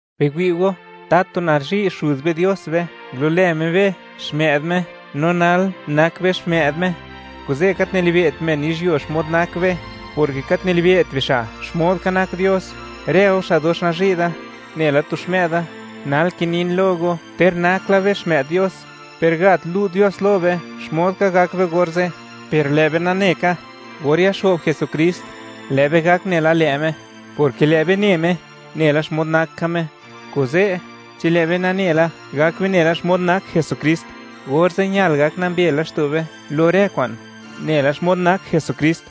Biwi' go, ¡tatu nazhi' Xuz be Dios be! Ngulu'lë Me be xmë'd Me, no nal, nak be xmë'd Me. Kuze', gat nilibe't men yizhyuo xmod nak be, porke gat nilibe't bixa' xmod ka nak Dios. Rë go xa' dox nazhi' da nela tu xmë'da, nal kinin lo go; ter nak la be xmë'd Dios, per gat lu' Dios lo be xmod ka gak be orze'; per lë' be nane ka, or yaxo'b Jesukrist, lë' be gak nela lë' Me, porke lë' be ne Me, nela xmod nak ka Me. Kuze', chi lë' be nane la, gak be nela xmod nak Jesukrist, orze' ñal gak nambe laxto' be lo rë kwa'n, nela xmod nak Jesukrist.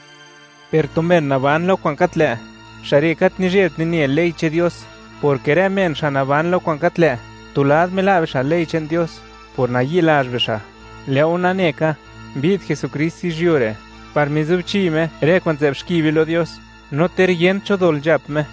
Per tu men naban lo kwa'n gat lë', xa' re' gat nizhebt nine ley che'n Dios, porke rë men xa' naban lo kwa'n gat lë', tu lad mila' bixa' ley che'n Dios por nayi'lazh bixa'. Lë' go nane ka, mbi'd Jesukrist yizhyuo re' par mizubchi Me rë kwa'n nzë'b xki be lo Dios; no ter yent cho dol nzhap Me.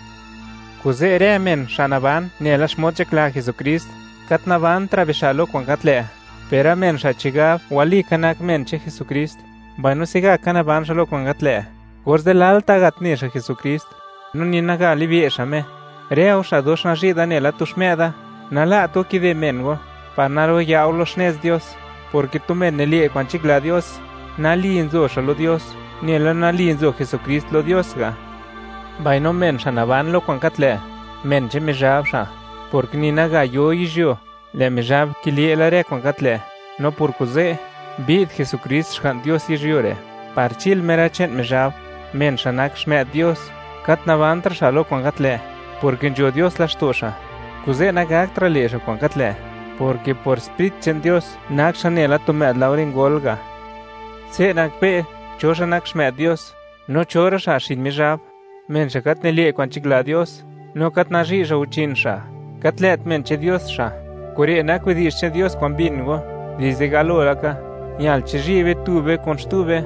Kuze', rë men xa' naban nela xmod nzhakla Jesukrist, gat nikizëtra' bixa' lo kwa'n gat lë'; per rë men xa' chigab walika nak men che'n Jesukrist, mbaino se'gaka naban xa' lo kwa'n gat lë', orze' lalta' gat ne xa' Jesukrist, no ni naga libe' xa' Me. Rë go xa' dox nazhi' da nela tu xmë'da, nala't go kide men go par naro'ya' go lo xnez Dios, porke tu men nile' kwa'n nzhakla Dios, nali nzo xa' lo Dios, nela nali nzo Jesukrist lo Dios ga'. Mbaino men xa' naban lo kwa'n gat lë', men che'n Mizhab xa'; porke ni naga yo yizhyuo, lë' Mizhab kile' la rë kwa'n gat lë'. No por kuze', mbi'd Jesukrist Xga'n Dios yizhyuo re', par chil Me rë che'n Mizhab. Men xa' nak xmë'd Dios, gat nikizëtra' xa' lo kwa'n gat lë', porke nzho Dios laxto' xa'; kuze' nagaktra' le' xa' kwa'n gat lë', porke por Sprit che'n Dios, nak xa' nela tu më'd laore ngol ga'. Se' nakbe' cho xa' nak xmë'd Dios, no cho rë xa' xin Mizhab: Men xa' gat nile' kwa'n nzhakla Dios, no gat nazhi' xa' guchin xa', gat lë't men che'n Dios xa'. Kure' nak widi'zh che'n Dios kwa'n mbin go dizde galo laka: Ñal chizhi' be tu be kun xtu be,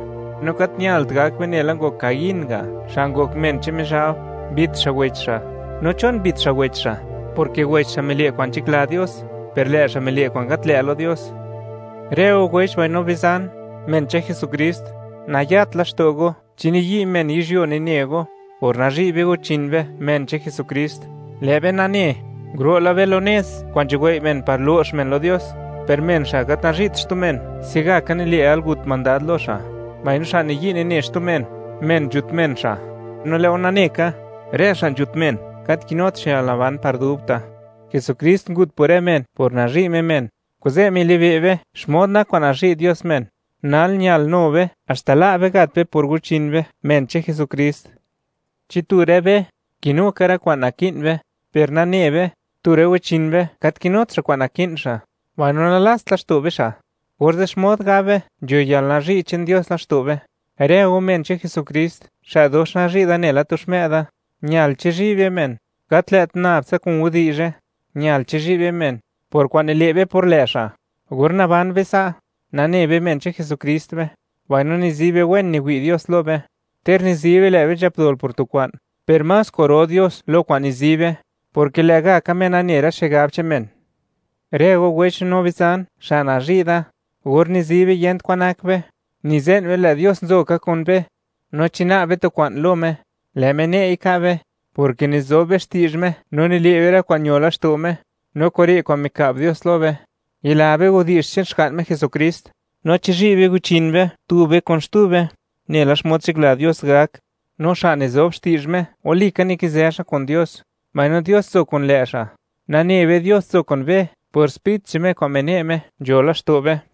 no gat ñalt gak be nela ngok Caín ga', xa' ngok men che'n Mizhab, mbit xa' wech xa'. No, ¿chon mbit xa' wech xa'? Porke wech xa' mile' kwa'n nzhakla Dios; per lë' xa' mile' kwa'n gat lë' lo Dios. Rë go wech mbaino bizan, men che'n Jesukrist, nayat laxto' go chi niyi' men yizhyuo nine go. Por nazhi' be guchin be, men che'n Jesukrist, lë' be nane, nguro' la be lo nez kwa'n nzhuwei' men par lo'x men lo Dios. Per men xa' gat nazhi't xtu men, se'gaka nile' yalgut mandad lo xa', mbaino xa' niyi' nine xtu men, men nzhut men xa'; no lë' go nane ka, rë xa' nzhut men, gat kinut xa' yalnaban par dubta'. Jesukrist ngut por rë men por nazhi' Me men. Kuze' milibe' be xmod nak kwa'n nazhi' Dios men. Nal, ñal nu be, haxta la' be gat be por guchin be, men che'n Jesukrist. Chi tu rë be kinu ka rë kwa'n naki'n be, per nane be, tu rë guchin be gat kinut xa' kwa'n naki'n xa', mbaino nalast laxto' be xa', orze', ¿xmod gab be, nzho yalnazhi' che'n Dios laxto' be? Rë go men che'n Jesukrist xa' dox nazhi' da nela tu xmë'da, ñal chizhi' be men, gat lë't nab tsa kun widi'zhe; ñal chizhi' be men por kwa'n nile' be por lë' xa'. Or naban be sa', nane be, men che'n Jesukrist be, mbaino nizi be, wen niwi' Dios lo be. Ter nizi be, lë' be nzhap dol por tu kwa'n, per más kwa'ro Dios lo kwa'n nizi be, porke lë'gaka Me nane rë xigab che'n men. Rë go wech no bizan, xa' nazhi' da, or nizi be, yent kwan nak be, nize'n be, lë' Dios nzo ka kun be. No chi na'b be tu kwa'n lo Me, lë' Me ne'i ka' be, porke nizo be xti'zh Me no nile' be rë kwa'n ño laxto' Me. No kure' kwa'n mika'b Dios lo be: Yila be widi'zh che'n Xga'n Me Jesukrist, no chizhi' be guchin be, tu be kun xtu be, nela xmod nzhakla Dios gak. No xa' nizob xti'zh Me, walika nikizë xa' kun Dios, mbaino Dios nzo kun lë' xa'. Nane be, Dios nzo kun be por Sprit che'n Me kwa'n mine' Me, nzho laxto' be.